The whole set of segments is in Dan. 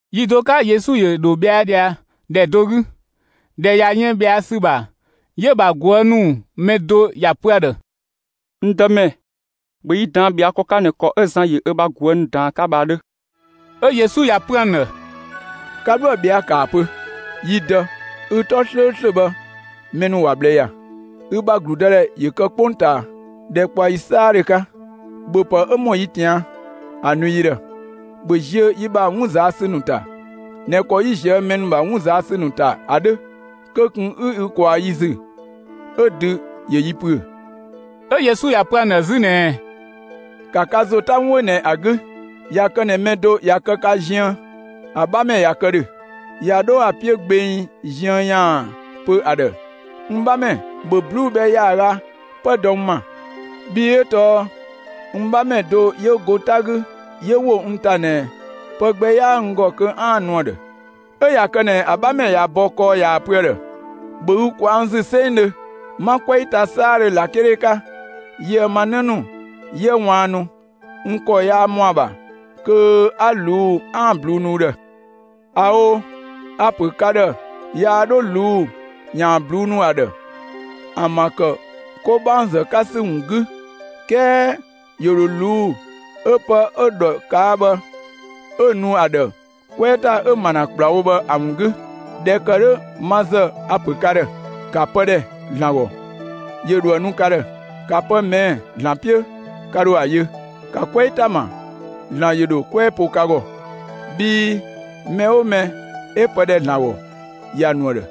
Yi do 'ka Yesu ‑yö ‑dho ꞊bhɛa' ꞊dhia ‑dhɛ do 'gü. ꞊Dhɛ ꞊ya yën ꞊bhɛa' ‑sü ‑bha, 'yö‑ ‑bha ꞊guë' ‑nu mɛ do ‑ya pö ‑a ‑dhë: «N Dëmɛ, ‑bhö yi ꞊daan' ꞊bhɛa' ‑kɔ 'ka ꞊nɛ ‑kɔ 'ö Zan ‑yö ö bha ꞊guë' ‑nu ꞊daan ‑a 'ka bhë ‑a 'dhö!» 'Ö Yesu ‑ya pö ‑an ‑dhë: «Ka 'dhoë‑ ꞊bhɛa'‑, ‑kaa pö: Yi Dë, ü 'tɔ 'slööslö bhë, mɛ ‑nu ‑wa ꞊bhlë ‑ya. Ü ‑bha ‑gludëdhɛ ‑yö kë 'kpongtaa. ‑Dhɛkpaɔyi 'saadhö 'ka, ‑bhöpë 'ö ‑mɔ yi ꞊tian' ‑a nu yi ‑dhë! ‑Bhö ziö yi ‑bha 'wun ꞊zaa' ‑sü ‑nu ‑ta ꞊nɛ ‑kɔ 'yi ꞊zië' mɛ ‑nu ‑bha 'wun ꞊zaa' ‑sü ‑nu ‑ta bhë ‑a 'dhö. Kö ꞊kun 'ü ü ꞊kwaa yi ‑zü 'ö dü ‑yö yi ‑püö!» 'Ö Yesu ‑ya pö ‑an ‑dhë 'zü ꞊nɛɛ: «‑Ka ka ‑zo 'ta 'wun 'ö ꞊nɛ ‑a 'gü, ꞊ya kë ꞊nɛ mɛ do ꞊ya kë ‑dhö ka ziën, ‑a 'bhamɛ ꞊ya kë ‑dhö, ꞊ya 'dho ‑a 'piö gbeng ziën ‑yaan pö ‑a ‑dhë: ‹N 'bhamɛ, ‑bhö 'bluu‑ bhɛ ‑yaaga 'pë dɔ n ‑ma, bhii 'ö tɔɔ n 'bhamɛ do 'yö go 'ta 'gü, 'yö ‑wo n ‑ta ꞊nɛ, pë gbɛ 'yaa n ‑gɔ kö 'aan‑ nu ‑a ‑dhë.› 'Ö ꞊ya kë ꞊nɛ, ‑a 'bhamɛ ꞊ya bɔ kɔɔ ꞊yaa‑ pö ‑a ‑dhë: ‹‑Bhö ü ꞊kwaa' n ‑zü 'sengdhö! 'Ma 'kwɛɛ ta 'saadhö ꞊lakele 'ka, yië‑ ma 'në ‑nu 'yië ꞊waannu, n ‑kɔ yaa ‑mɔ ‑a ‑bha kö 'a ꞊luu'‑ 'aan‑ 'bluu‑ nu ü ‑dhë!› ꞊Ao', a‑ ‑pö ka ‑dhë yaa 'dho ꞊luu' ‑yaan 'bluu‑ nu ‑a ‑dhë, ‑an ‑bha ‑kë 'kobaɔngzë 'ka ‑sü ‑wun 'gü, 'kɛɛ ‑yö ‑dho ꞊luu'‑ 'ö pë 'ö ‑dhɔ ꞊kaa' bhë 'ö‑ nu ‑a ‑dhë 'kwɛɛ ‑ta 'ö ‑ma ‑na ‑kplawo bhë ‑a ‑wun 'gü. ꞊Dhɛ ‑kë 'dhö ma ‑zë a‑ ‑pö ka ‑dhë: ‑Ka pë ‑dhɛ ‑Zlan ‑gɔ, ‑yö ‑dho ‑a nu ka ‑dhë; ‑ka pë ꞊mɛɛ' ‑Zlan 'piö, ka ‑dho ‑a yö; ‑ka 'kwɛɛ ‑ta ‑ma, ‑Zlan ‑yö ‑dho 'kwɛɛ po ka ‑gɔ. Bhii mɛ 'oo mɛ 'ö pë ‑dhɛ ‑Zlan ‑gɔ, ‑ya ‑nu ‑a ‑dhë;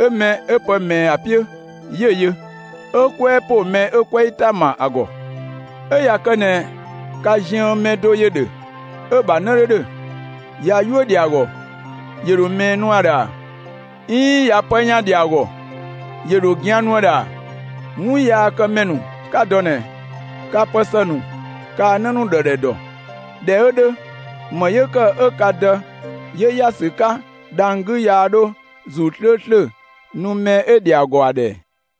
'ö mɛ 'ö pë ꞊mɛɛ ‑a 'piö, 'yö‑ yö; 'ö 'kwɛɛ ‑po mɛ 'yö 'kwɛɛ ‑ta ‑ma ‑a ‑gɔ. 'Ö ꞊ya kë ꞊nɛ ka ziën mɛ do ‑yö ‑dhö 'ö‑ ‑bha 'në 'dho ‑dhö, ꞊ya 'yuö‑ ‑dhɛ ‑a ‑gɔ, ‑yö ‑dho ꞊mɛɛ nu ‑a ‑dhë ‑a? 'Iin ꞊ya pë ‑yan ‑dhɛ ‑a ‑gɔ, ‑yö ‑dho gian nu ‑a ‑dhë ‑a? 'Wunyaakëmɛ ‑nu 'ka dɔ ꞊nɛ, ka pë ‑së ‑nu kaa‑ 'në ‑nu ‑dhë ‑dhɛ ‑dɔ. ꞊Dhɛ 'ö 'dhö, ‑më 'yö ‑kë 'ö ka Dë 'yö ‑ya ‑sü 'ka dhang‑ 'gü, yaa 'dho ‑Zuu 'slööslö nu mɛ 'ö‑ ‑dhɛ ‑a ‑gɔ ‑a ꞊dhë ꞊ɛ?»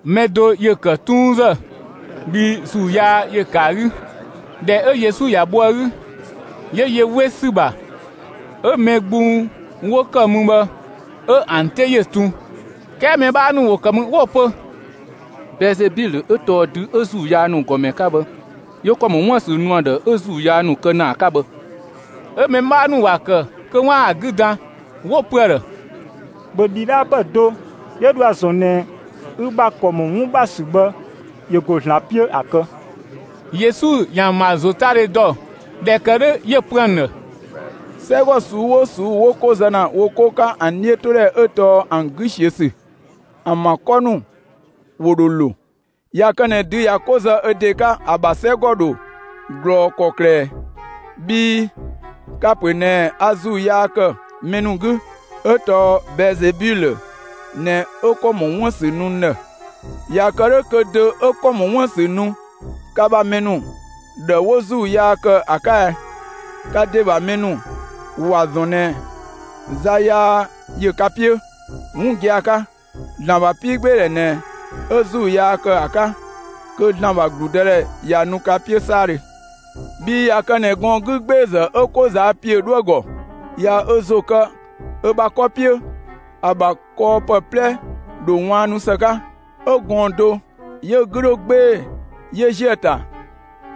Mɛ do ‑yö ‑kë 'tuunzë, bhii ‑zuu yaa ‑yö ‑kë ‑a 'gü. ꞊Dhɛ 'ö Yesu ‑ya bho ‑a 'gü, 'yö yö 'we ‑sü ‑bha. 'Ö mɛ gbung 'wo ‑kë mü bhë 'ö ‑an 'te ‑yö tun. 'Kɛɛ mɛ 'bhaa ‑nu ‑wo ‑kë mü 'wo‑ pö: «Bɛɛzebilö 'ö tɔɔ dü 'ö ‑zuu yaa ‑nu ‑gɔmɛ 'ka bhë, 'yö ‑kɔ ‑mɔ 'wun ‑bha ‑sü nu ‑a ‑dhë, 'ö ‑zuu yaa ‑nu kë ‑na ‑a 'ka bhë!» 'Ö mɛ 'bhaa ‑nu ‑wa ‑kë kö 'waan‑ ‑a 'gü dan 'wo‑ pö ‑a ‑dhë: «‑Bhö ‑dhidhaapë do 'yö dho ‑a ‑zɔn ꞊nɛ ü bha ‑kɔ ‑mɔ 'wun ‑bha ‑sü bhë ‑yö ‑go ‑Zlan 'piö ‑a kë!» Yesu ‑yö ‑an ‑bha ‑zotadhe ‑dɔ. ꞊Dhɛ ‑kë 'dhö, 'yö‑ pö ‑an ‑dhë: «'Sɛgɔ ꞊suu'‑ 'oo ꞊suu'‑ 'wo 'ko zë ‑na wo 'ko 'ka ‑an 'dhiötodhɛ 'ö tɔɔ ‑an 'gü ꞊siö' ‑sü, ‑an ‑bha 'kɔ ‑nu ‑wo ‑dho ‑lo. ꞊Ya kë ꞊nɛ dü ꞊ya 'ko zë ö ‑de 'ka, ‑a ‑bha 'sɛgɔ ‑dho ꞊glɔɔ ‑kɔklë ꞊ɛ? Bhii ka‑ ‑pö ꞊nɛɛ a ‑zuu yaa ‑kë mɛ ‑nu 'gü, 'ö tɔɔ Bɛɛzebilö ꞊nɛ 'ö ‑kɔ ‑mɔ 'wun ‑bha ‑sü nu n ‑dhë. ꞊Ya kë 'dhö kö dö 'ö ‑kɔ ‑mɔ 'wun ‑bha ‑sü nu ka ‑bha mɛ ‑nu ‑dhë 'wo ‑zuu yaa ‑kë ‑a 'ka ɛ? Ka ‑de ‑bha mɛ ‑nu ‑wa ‑zɔn ꞊nɛ za yaa ‑yö ka 'piö. 'Wun gia‑ 'ka, ‑Zlan ‑bha 'piigbeedhɛ ꞊nɛ 'a ‑zuu yaa ‑kë ‑a 'ka, kö ‑Zlan ‑bha ‑gludëdhɛ ꞊ya nu ka 'piö 'saadhö. Bhii ꞊ya kë ꞊nɛ gɔɔn‑ 'gügbeezë 'ö 'ko ꞊zaa' ‑piö 'dhoë‑ ‑gɔ, ꞊ya ö ‑zo kë ö bha 'kɔ 'piö, ‑a ‑bha kɔɔpë 'plɛ ‑dho ꞊waannu ‑së 'ka. 'Ö gɔɔn‑ do 'yö‑ 'gü 'dho 'gbee‑ 'yö ‑ziö ‑a ‑ta,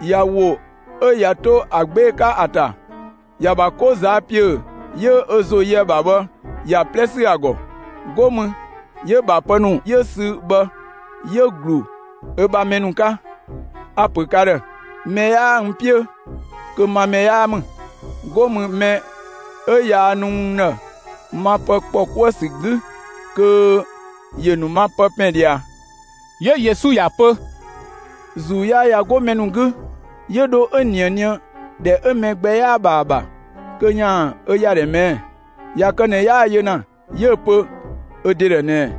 ꞊ya ‑wo 'ö ꞊ya 'to ‑a 'gbee‑ 'ka ‑a ‑ta, ‑ya ‑bha 'ko ꞊zaa' ‑piö 'yö ö ‑zo yö ‑a ‑bha bhë ‑ya 'plɛ ‑sü ‑a ‑gɔ; 'go mü 'yö‑ ‑bha pë ‑nu 'yö‑ sü bhë, 'yö‑ ‑glu ö ‑bha mɛ ‑nu 'ka. A‑ ‑pö ka ‑dhë: Mɛ 'yaa n 'piö, kö ma mɛ 'yaa ‑mü; 'go mü mɛ 'ö yaa nu n ‑dhë ma pë ‑kpɔ 'kuë‑ ‑sü 'gü, kö ‑yö ‑nu n ‑ma pë 'pɛn ꞊dhia.» 'Yö Yesu ‑ya pö: «‑Zuu yaa ꞊ya 'go mɛ ‑nu 'gü, 'yö dho 'ö ꞊nië nië ‑dhɛ 'ö mɛ gbɛ 'yaa‑ ‑bha ‑a ‑bha kö ‑yaan ö ‑yadhɛ ꞊mɛɛ'‑. ꞊Ya kë ꞊nɛ 'yaa‑ yö ‑na, 'yö‑ pö ö ‑de ‑dhë ꞊nɛɛ: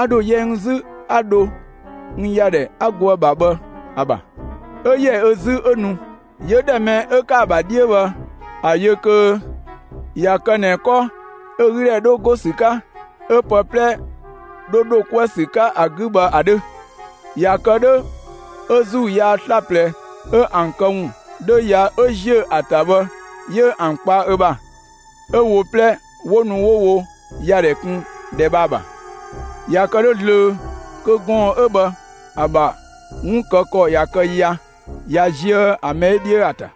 ‹A ‑dho yɛ n 'zü 'a dho n ‑yadhɛ 'a go ‑a ‑bha bhë ‑a ‑bha.› 'Ö ‑yɛ ö 'zü 'yö nu; 'yö ‑dhɛ mɛ 'ö ‑kë ‑a ‑bha 'dhiö bhë ‑a yö kö ꞊ya kë ꞊nɛ 'kɔ 'ö ‑a 'gü ‑dhɛ 'dho go ‑sü 'ka, 'ö pë 'plɛ 'dho ‑dho 'kuë‑ ‑sü 'ka ‑a 'gü bhë ‑a 'dhö. ꞊Ya kë 'dhö 'ö ‑zuu yaa 'slaplɛ 'ö ‑an këwun 'dho ya 'ö ꞊ziö' ‑a ‑ta bhë 'yö ‑an kpa ö ‑bha, 'ö wo 'plɛ 'wo nu 'wo wo ‑yadhɛ kun ‑dhɛ bhë ‑a ‑bha. ꞊Ya kë 'dhö zlöö kö gɔɔn‑ 'ö bhë ‑a ‑bha 'wun kë ‑kɔ ꞊ya kë ya, ꞊ya ziö ‑a mɛ 'ö 'dhiö ‑a ‑ta.»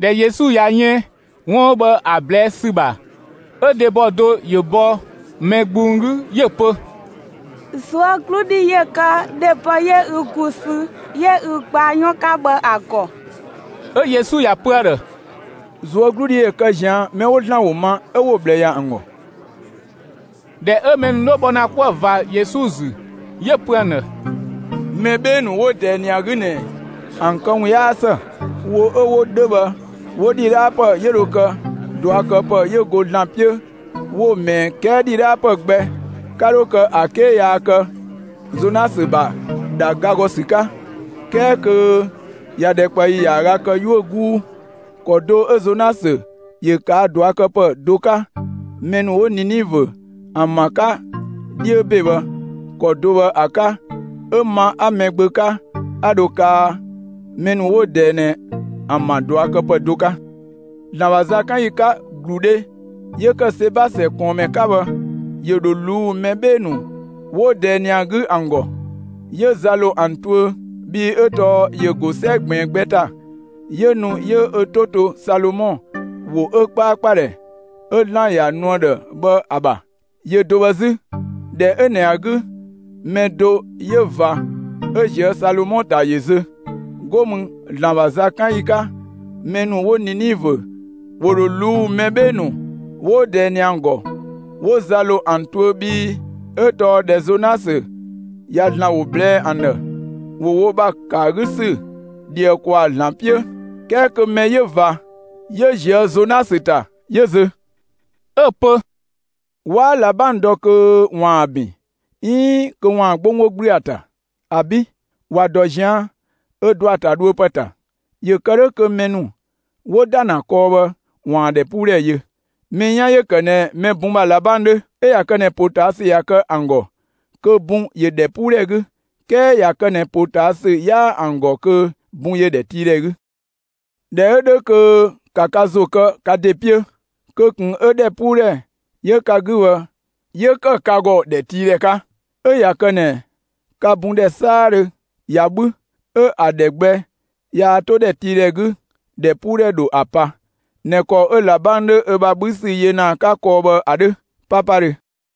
꞊Dhɛ Yesu ꞊ya yën 'wun 'ö bhë ‑a ꞊blɛɛ' ‑sü ‑bha, 'ö dhebɔ do ‑yö ‑bɔ mɛ gbung 'gü, 'yö‑ pö: «꞊Zuögludhi ‑yö kë dhebɔ 'yö ü ‑gu sü 'yö ü gbaa 'yɔn 'ka bhë ‑a ‑gɔ!» 'Ö Yesu ‑ya ‑pö ‑a ‑dhë: «꞊Zuögludhi ‑yö kë ꞊zian' mɛ 'wo ‑Zlan ‑wo ma 'ö 'wo‑ ꞊bhlë ‑ya ‑an ‑gɔ.» ꞊Dhɛ 'ö mɛ ‑nu 'dho bhɔ ‑na 'kuë‑ ꞊va Yesu ‑zü, 'yö‑ pö ‑an ‑dhë: «Mɛ 'bhee‑ ‑nu 'wo ꞊dɛɛ ꞊nɛ ‑a 'gü ꞊nɛ ‑an këwun 'yaa ‑së; wo 'ö 'wo 'dhö bhë, 'wo ‑dhidhaapë 'yö dho kë ꞊duakëpë 'yö go ‑Zlan 'piö 'wo‑ ꞊mɛɛ, 'kɛɛ ‑dhidhaapë gbɛ 'ka 'dho kë ‑a 'ke yaa kë Zonasö ‑bha ‑dha ga ‑gɔ ‑sü 'ka; ('kɛɛ kö ꞊ya ‑dhɛkpaɔyi ‑yaaga kë 'yuö‑ 'guu). ‑Kɔ do 'ö Zonasö ‑yö ꞊kaa' ꞊duakëpë do 'ka, mɛ ‑nu 'wo Ninivö ‑an ‑bha 'ka 'dhiö ‑be bhë, ‑kɔ do bhë ‑a 'ka 'ö ma 'a Mɛgbö 'ka 'a dho kaa mɛ ‑nu 'wo ꞊dɛɛ ꞊nɛ ‑an ‑bha ꞊duakëpë do 'ka. ‑Zlan ‑bha zakanyi 'ka, ‑gludhe 'yö ‑kë Seba ‑sɛ ꞊kɔɔnmɛ 'ka bhë ‑yö ‑dho ꞊luu'‑ mɛ 'bhee‑ ‑nu 'wo ꞊dɛɛ ꞊nɛ ‑a 'gü ‑an ‑gɔ, 'yö za ‑lo ‑an tuö; bhii 'ö tɔɔ ‑yö ‑go 'sɛ ꞊gbiin gbɛ ‑ta, 'yö nu 'yö ö 'to to Salomɔ ‑wo 'ö 'kpaakpadhɛ 'ö ‑Zlan ‑ya nu ‑a ‑dhë bhë ‑a ‑bha. Yö do bhë 'zü, ‑dhɛ 'ö ꞊nɛ ‑a 'gü mɛ do 'yö ꞊va 'ö ꞊zië' Salomɔ ‑ta ‑yö zö. 'Go mü ‑Zlan ‑bha zakanyi 'ka, mɛ ‑nu 'wo Ninivö ‑wo ‑dho ꞊luu'‑ mɛ 'bhee‑ ‑nu 'wo ꞊dɛɛ ꞊nɛ ‑an ‑gɔ, 'wo za ‑lo ‑an tuö, bhii 'ö tɔɔ ꞊dhɛ Zonasö ꞊ya ‑Zlan ‑wo ꞊blɛɛ'‑ ‑an ‑dhë, ‑wo wo ‑bha ‑kë ‑a 'gü ‑sü ꞊dhië ‑kwaa ‑Zlan 'piö, 'kɛɛ kö mɛ 'yö ꞊va 'yö ꞊zië' Zonasö ‑ta 'yö zö.» 'Ö‑ pö: «'Waa ꞊labang dɔ kö ‑waan ‑a ‑bin, 'iin kö ‑waan 'gbonggbo 'gblü ‑a ‑ta. ‑Abi'! ‑Wa ‑dɔ ꞊zian' ö ‑dɔ ‑a ‑ta dhuö ‑pë ‑ta; ‑yö ‑kë 'dhö kö mɛ ‑nu 'wo ‑da ‑na kɔɔ bhë ‑waan ‑dhɛpuudhɛ yö. Mɛ 'yan ‑yö ‑kë ꞊nɛ mɛ bun ‑bha ꞊labang 'dhö. 'Ö ꞊ya kë ꞊nɛ ‑potaasü ꞊ya kë ‑an ‑gɔ, kö bun ‑yö ‑dhɛpuudhɛ 'gü; 'kɛɛ ꞊ya kë ꞊nɛ ‑potaasü 'yaa ‑an ‑gɔ kö bun ‑yö ‑dhɛtiidhɛ 'gü. ꞊Dhɛ 'ö 'dhö kö ‑ka ka ‑zo kë ka ‑de 'piö, kö ꞊kun 'ö ‑dhɛpuudhɛ 'yö ka 'gü bhë 'yö ‑kë ka ‑gɔ ‑dhɛtiidhɛ 'ka. 'Ö ꞊ya kë ꞊nɛ ka bun ‑dhɛ 'saadhö ꞊ya 'bhü, 'ö ‑a ‑dhɛ gbɛ yaa 'to ‑dhɛtiidhɛ 'gü, ‑dhɛpuudhɛ ‑dho ‑a pa ꞊nɛ ‑kɔ 'ö ꞊labang 'dho ö bha 'bhü ‑sü yö ‑na ‑a 'ka kɔɔ bhë ‑a 'dhö 'papadhö.»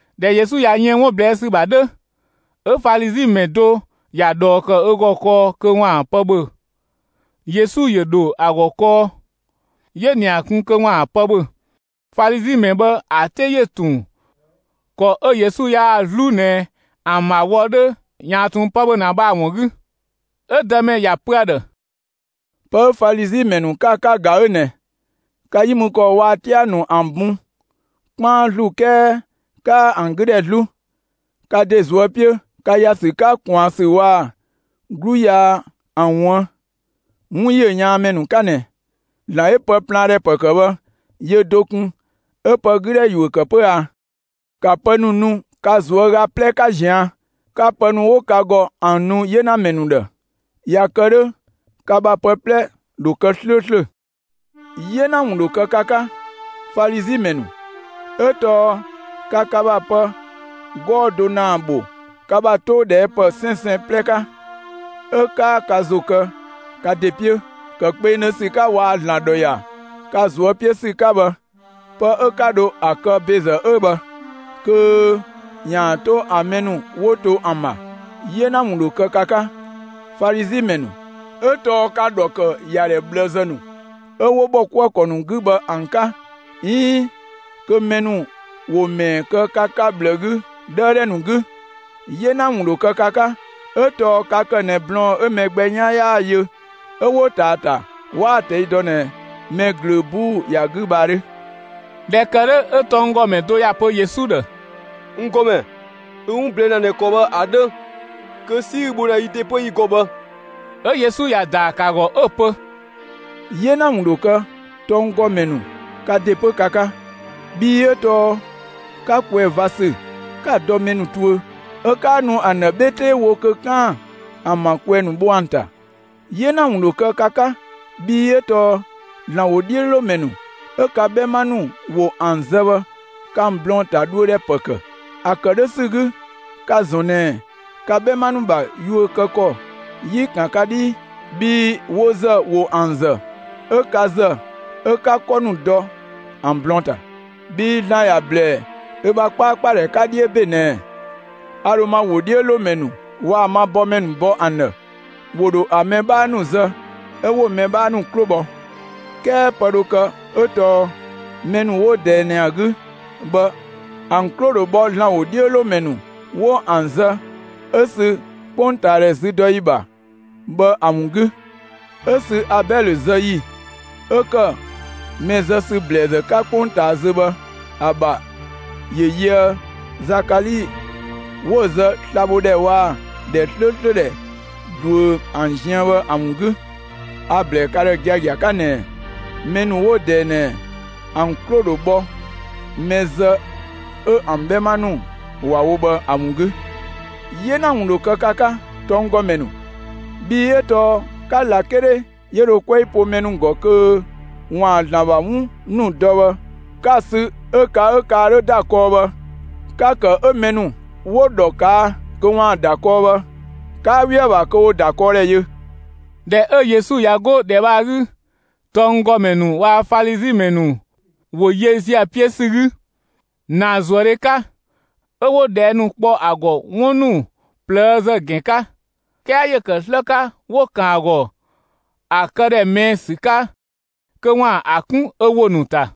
꞊Dhɛ Yesu ꞊ya yën 'wun ꞊blɛɛ' ‑sü ‑bha 'dhö, 'ö Falizi ‑mɛ do ‑ya ꞊dhɔɔ ‑kë ö ‑gɔ kɔɔ kö 'waan‑ pë ‑bhö. Yesu ‑yö ‑dho ‑a ‑gɔ kɔɔ, 'yö‑ ‑nia kun kö ‑waan pë ‑bhö. Falizi ‑mɛ bhë ‑a 'te ‑yö ‑tun ‑kɔ 'ö Yesu yaa‑ 'zlu ꞊nɛ ‑an ‑bha wɔ 'dhö ‑yaan ꞊tun pë ‑bhö ‑na bhë ‑a ‑wun 'gü. 'Ö Dëmɛ ‑ya pö ‑a ‑dhë: «Pë 'ö Falizi ‑mɛ ‑nu, 'ka ‑a 'ka, ꞊ga 'ö ꞊nɛ: Ka 'yi mü ‑kɔɔ ‑nu waa‑ 'tia‑ ‑nu ‑an bun 'kpaan ‑zlu 'kɛɛ 'kaa ‑an 'gü ‑dhɛ 'zlu; ka ‑de ꞊zuö' 'piö, ka ‑ya ‑sü 'ka ꞊kwaan ‑sü waa‑ 'glu yaa ‑an ‑wuën! 'Wun ‑yö 'yaan ‑mɛ ‑nu 'ka ꞊nɛ! ‑Zlan 'yö pë plaan ‑dhɛ ‑pë ‑kë bhë, yö do kun 'ö pë 'gü ‑dhɛ ‑yuö ‑kë 'pö a? ‑Ka pë ‑nu nu ka ꞊zuöga 'plɛ 'ka ꞊zian', 'ka pë ‑nu 'wo ka ‑gɔ ‑an nu 'yenamɛ ‑nu ‑dhë; ꞊ya kë 'dhö ka ‑bha pë 'plɛ ‑dho kë 'slööslö. 'Yena ‑wun ‑dho kë ka 'ka, Falizi ‑mɛ ‑nu, 'ö tɔɔ ka ka ‑bha pë 'gɔɔ‑ do ‑naa ‑bho ka ‑bha 'too ꞊dhɛɛ' ‑pë 'sɛnsɛn 'plɛ 'ka, 'ö 'kaa ka ‑zo ‑kë ka ‑de 'piö, ‑kë kpengdhö ‑sü 'ka waa‑ ‑Zlan ‑dhɔ ‑ya ka ꞊zuö' 'piö ‑sü 'ka bhë. Pë 'ö 'ka dho ‑a kë ‑bezë 'ö bhë, kö ‑yaan 'to ‑an mɛ ‑nu 'wo to ‑an ‑bha. 'Yena ‑wun ‑dho kë ka 'ka, Falizi ‑mɛ ‑nu, 'ö tɔɔ ka‑ ‑dhɔ ‑kë ‑yadhɛ ꞊bhlëzë ‑nu 'ö 'wo ‑bhɔkuëkɔ ‑nu 'gü bhë ‑an 'ka 'iin kö mɛ ‑nu ‑wo ‑mɛɛ kë ka 'ka ꞊bhlë 'gü 'dhëëdhɛ ‑nu 'gü. 'Yena ‑wun ‑dho kë ka 'ka, 'ö tɔɔ ka ‑kë ꞊nɛ blɔɔn‑ 'ö mɛ gbɛ 'yan 'yaa‑ yö 'ö 'wo ꞊taa ‑a ‑ta, 'waa ‑a ꞊tɛi' dɔ ꞊nɛ mɛ ꞊glöö 'buu ‑ya 'gü bhë ‑a 'dhö!» ꞊Dhɛ ‑kë 'dhö 'ö tɔnggɔmɛ do ‑ya pö Yesu ‑dhë: «N ‑Gɔmɛ, ü 'wun ꞊blɛɛ' ‑na ꞊nɛ ‑kɔ bhë ‑a 'dhö kö 'si 'ü‑ bho ‑na yi ‑de 'pö yi ‑gɔ bhë!» 'Ö Yesu ‑ya ‑daa ‑kë ‑a ‑gɔ 'ö‑ pö: «'Yena ‑wun ‑dho kë tɔnggɔmɛ ‑nu ka ‑de 'pö ka 'ka! Bhii 'ö tɔɔ ka ꞊kwɛɛ‑ ꞊va ‑sü 'ka‑ dɔ mɛ ‑nu tuö 'ö 'kaa nu ‑an ‑dhë 'bhe 'tee wo kö 'kaan‑ ‑an ‑bha ꞊kwɛɛ‑ ‑nu bho ‑an ‑ta. 'Yena ‑wun ‑dho kë ka 'ka! Bhii 'ö tɔɔ ‑Zlan ‑wodhiölomɛ ‑nu 'ö ka 'bhɛma ‑nu ‑wo ‑an zë bhë ka‑ blɔɔn‑ ‑ta dhuö ‑dhɛ ‑pë ‑kë. ‑A ‑kë 'dhö ‑sü 'gü ka‑ ‑zɔn ꞊nɛ ka 'bhɛma ‑nu ‑bha yuö kë ‑kɔ 'yi‑ ‑kan ka 'dhii! Bhii wo ‑zë ‑wo ‑an ‑zë, 'ö ka ‑zë 'ö 'ka 'kɔ ‑nu dɔ ‑an blɔɔn‑ ‑ta. Bhii ‑Zlan ‑ya ‑blɛɛ ö ‑bha 'kpaakpadhɛ 'ka 'dhiö ‑be ꞊nɛɛ: A ‑dho ma ‑wodhiölomɛ ‑nu waa‑ ma bɔmɛ ‑nu bɔ ‑an ‑dhë; ‑wo ‑dho ‑a mɛ 'bhaa ‑nu zë 'ö 'wo‑ mɛ 'bhaa ‑nu 'klo bhɔ. 'Kɛɛ pë dho kë 'ö tɔɔ mɛ ‑nu 'wo ꞊dɛɛ ꞊nɛ ‑a 'gü bhë, ‑an 'klo ‑dho bhɔ ‑Zlan ‑wodhiölomɛ ‑nu 'wo ‑an zë 'ö sü 'kpongtaadhɛ züdɔyi ‑bha bhë ‑a ‑wun 'gü 'Ö sü Abɛlö zë ‑yi 'ö ‑kë mɛ zë ‑sü ‑blɛɛzë 'ka 'kpongtaa zö bhë ‑a ‑bha ‑yö yöë Zakali 'wo‑ zë sla‑ bho ‑dhɛ waa‑ ‑dhɛ 'slööslö ‑dhɛ ꞊duö ‑an ziën bhë ‑a ‑wun 'gü. A‑ ‑blɛɛ ka ‑dhë giagia 'ka ꞊nɛɛ: Mɛ ‑nu 'wo ꞊dɛɛ ꞊nɛ, ‑an 'klo ‑dho bhɔ mɛ zë 'ö ‑an 'bhɛma ‑nu ‑wa wo bhë ‑a ‑wun 'gü. 'Yena ‑wun ‑dho kë ka 'ka, tɔnggɔmɛ ‑nu, bhii 'ö tɔɔ 'ka ꞊lakele 'yö dho 'kwɛɛ po mɛ ‑nu ‑gɔ kö ‑waan ‑Zlan ‑bha 'wun ‑nu dɔ bhë, 'ka‑ sü 'ö ka 'ö ka 'ka 'dho ‑da kɔɔ bhë, 'ka‑ ‑kë 'ö mɛ ‑nu 'wo‑ ‑dhɔ ꞊kaa' kö 'waan‑ ‑da kɔɔ bhë, 'kaa 'we ‑a ‑bha kö ‑wo ‑dakɔɔdhɛ yö.» ꞊Dhɛ 'ö Yesu ꞊ya 'go ‑dhɛ bhë ‑a 'gü, tɔnggɔmɛ ‑nu waa‑ Falizi ‑mɛ ‑nu ‑wo yö ‑ziö ‑a 'piö ‑sü 'gü ‑naazuëdhe 'ka, 'ö 'wo ꞊dhɛɛ' ‑nu kpɔ ‑a ‑gɔ 'wun ‑nu ꞊plëëzë ‑gɛn 'ka; 'kɛɛ ‑yö ‑kë 'slë 'ka 'wo‑ ‑kan ‑a ‑gɔ ‑a këdhɛ ꞊mɛɛ' ‑sü 'ka kö ‑waan ‑a 'kun ö ‑wo ‑nu ‑ta.